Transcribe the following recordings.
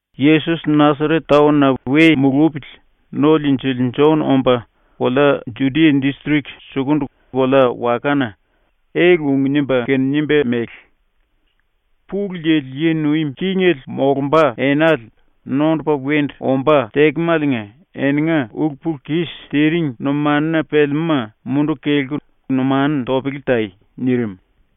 ⸤Yesos Nasaret taon-na we mulupili⸥ No-Liinjili Jon omba kolea Judia distrik sukundu kolea-wakana ele-ung nimba kene nimba mele: “Pulu Yili yi nuim kingele molumba enale nondupa wendu ombá tekemaliinga eninga ulu-pulu-kis tiring numanuna pelemúma munduku kelku numanu topele tai.” nirim.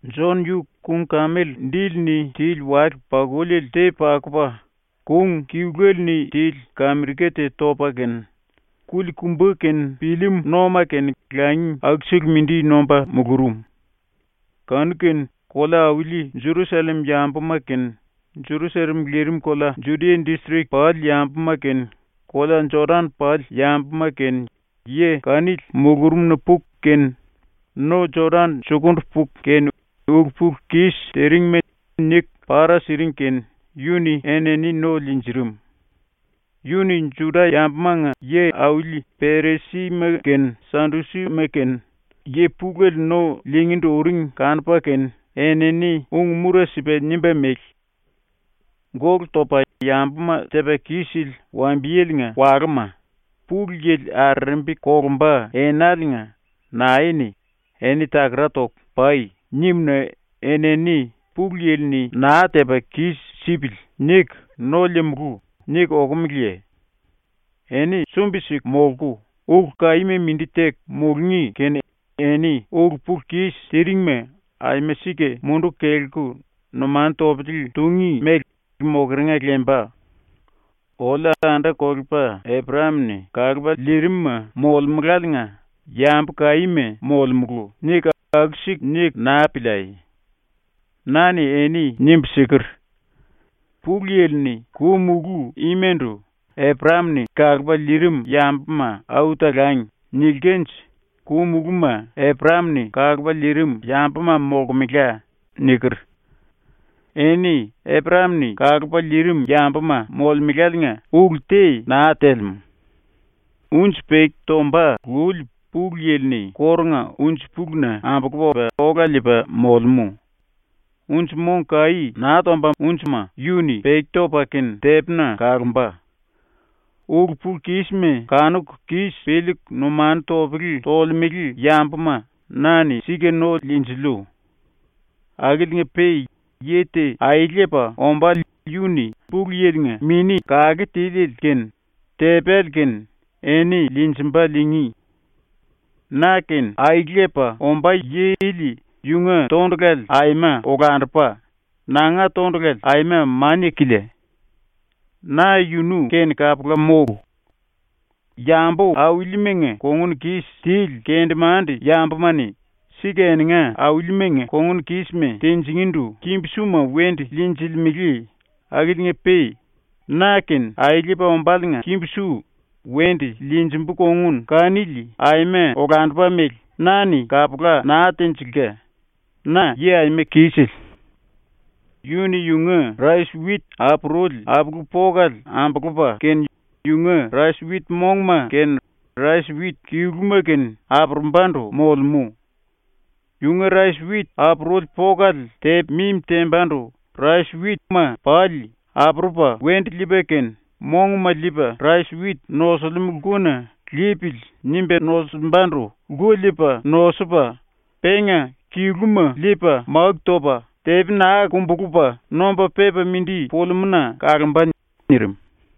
Jon yu kung-kemel dili-ni tili wale-pakuli te pakupa, kung kiluele-ni tili kamirika te topa kene, kuli-kumba kene pillim-nóma kene langi akusele mindi nomba mulurum. Kanu-kene kolea-auli Jerusallem yambuma kene Jerusallem lirim kolea Judia distrik pali yambuma kene kolea Jodan pali yambuma kene yi kanili mulurumna puku kene, no Jodan sukundu puku kene ulu-pulu-kis tiringma niku para siring kene yu-ni enini no liinjirim. Yu-ni ⸤Juda-yambumanga yi-auli⸥ Perisima kene Sadusima kene yi pulele no liingíndu uring kanupa kene, enini ung-mura sipa nimba mele: “Gólu topa yambuma tepa kis-sili wambiyelenga walúma, Pulu Yili arerembi kolumba enaliinga nae-ni “Eni takara toku pai.” nim-na enini ‘Pulu Yili-ni naa tepa kis-sipili.’ niku ‘No liimulú.’ niku okumeleye? Eni sumbi-siku molku, ulu kaíma mindi teku mulungí kene eni ulu-pulu-kis tiringma aima sika munduku kelku numanu topele tungí mele mokeringa lemba. “Oliu anda-kolepa Eprayam-ni kalupa liirimuma molemuláliinga yambu kaíma molemulu.” niku aku-siku niku naa piliai. Na-ni eni nimbu siker: “Pulu Yili-ni ku-mulú imandu “Eprayam-ni kalupa liirim yambuma au talangi.” nilkanje ku-mulúma Eprayam-ni kalupa liirim yambuma molkemela.” niker. Eni Eprayam-ni kalupa liirim yambuma molemeláliinga ulu te naa telemú. “Unji peki tomba luli Pulu Yili-ni kórunga unji-puluna ambulupa ola liipa molemú. Unji-mong kaí naa tombama yu-ni peki topa kene tepina kalomba. Ulu-pulu-kísima kanuku kis piliiku numanu topele tolemele yambuma na-ni sika no liinjiliu. Akiliinga-pe yi te aelepa ombále yu-ni ⸤Pulu Yili-nga⸥ Mini Kake Tiliele kene tepéle kene eni liinjimba ⸤liingí⸥. Na kene aelepa ombá yi ili yunga tondulale aima olandupa, nanga tondulale aima mania-kilia. Na yunu-kene kapula mólu. Yambu-aulimanga kongun kis tili kendemande-yambuma-ni sika eninga aulimanga kongun kísima tinjingíndu kimbu-suma wendu liinjilimele akiliinga-pe na-kene aelepa ombáliinga kimbu-su wendu liinjimbu kongun kanili aima olandupa mele na-ni kapula naa tenjilka, ⸤na yi aima kisele⸥. “Yu-ni yunga rais-wit apuruli apulu-pokale ambulupa kene yunga rais-wit monguma kene rais-wit kiluma kene apurumbandu molemú. Yunga rais-wit apuruli polale tepa mimi tembandu rais-witma pali apurupa wendu liipa kene monguma liipa rais-wit nosilimú lkuna ‘Lipili.’ nimba nosimbandu lku liipa nosupa, penga kiluma liipa máku topa tepi naa kumbulupa nomba pepa mindi pulimúna kalomba.” nirim.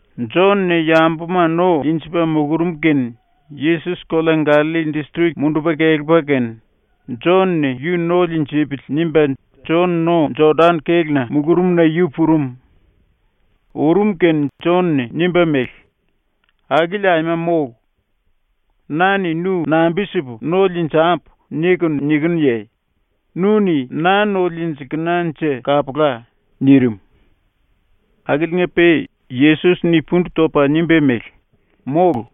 ⸤Jon-ni yambuma no liinjipa mulurum⸥ kene Yesos kolea Gallalli distrik mundupa kelepa kene, ‘Jon-ni yu no liinjipili.’ nimba Jon no-Jodan kéluna mulurumna yu purum. Urum kene Jon-ni nimba mele: “Akili aima mólu. Na-ni nu nambi-sipu no liinjambu nikunu nikinuye? Nu-ni na no liinjilkenanje kapula.” nirim. Akiliinga-pe Yesos-ni pundu topa nimba mele: “Mólu.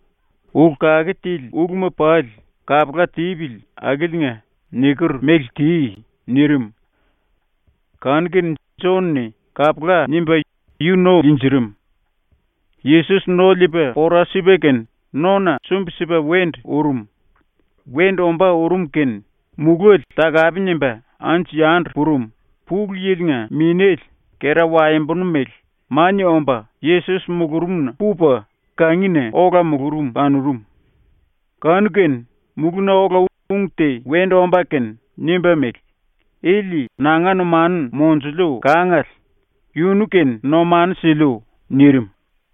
Ulu kake tili uluma pali kapula tipili akiliinga niker mele ti.” nirim. Kanu-kene Jon-ni “Kapula.” nimba yu no liinjirim. Yesos no liipa pora sipa kene nona sumbi-sipa wendu urum. Wendu ombá urum kene muléle takape nimba anju-yandu purum, Pulu Yili-nga Minéle, kera-waembonu mele, mania omba Yesos mulurumna pupa ⸤kangina⸥ ola mulurum kanurum. Kanu-kene mulúna ola ung te wendu omba kene nimba mele: “Ili nanga numanu monjuliu kangale. Yunu-kene numanu siliu.” nirim.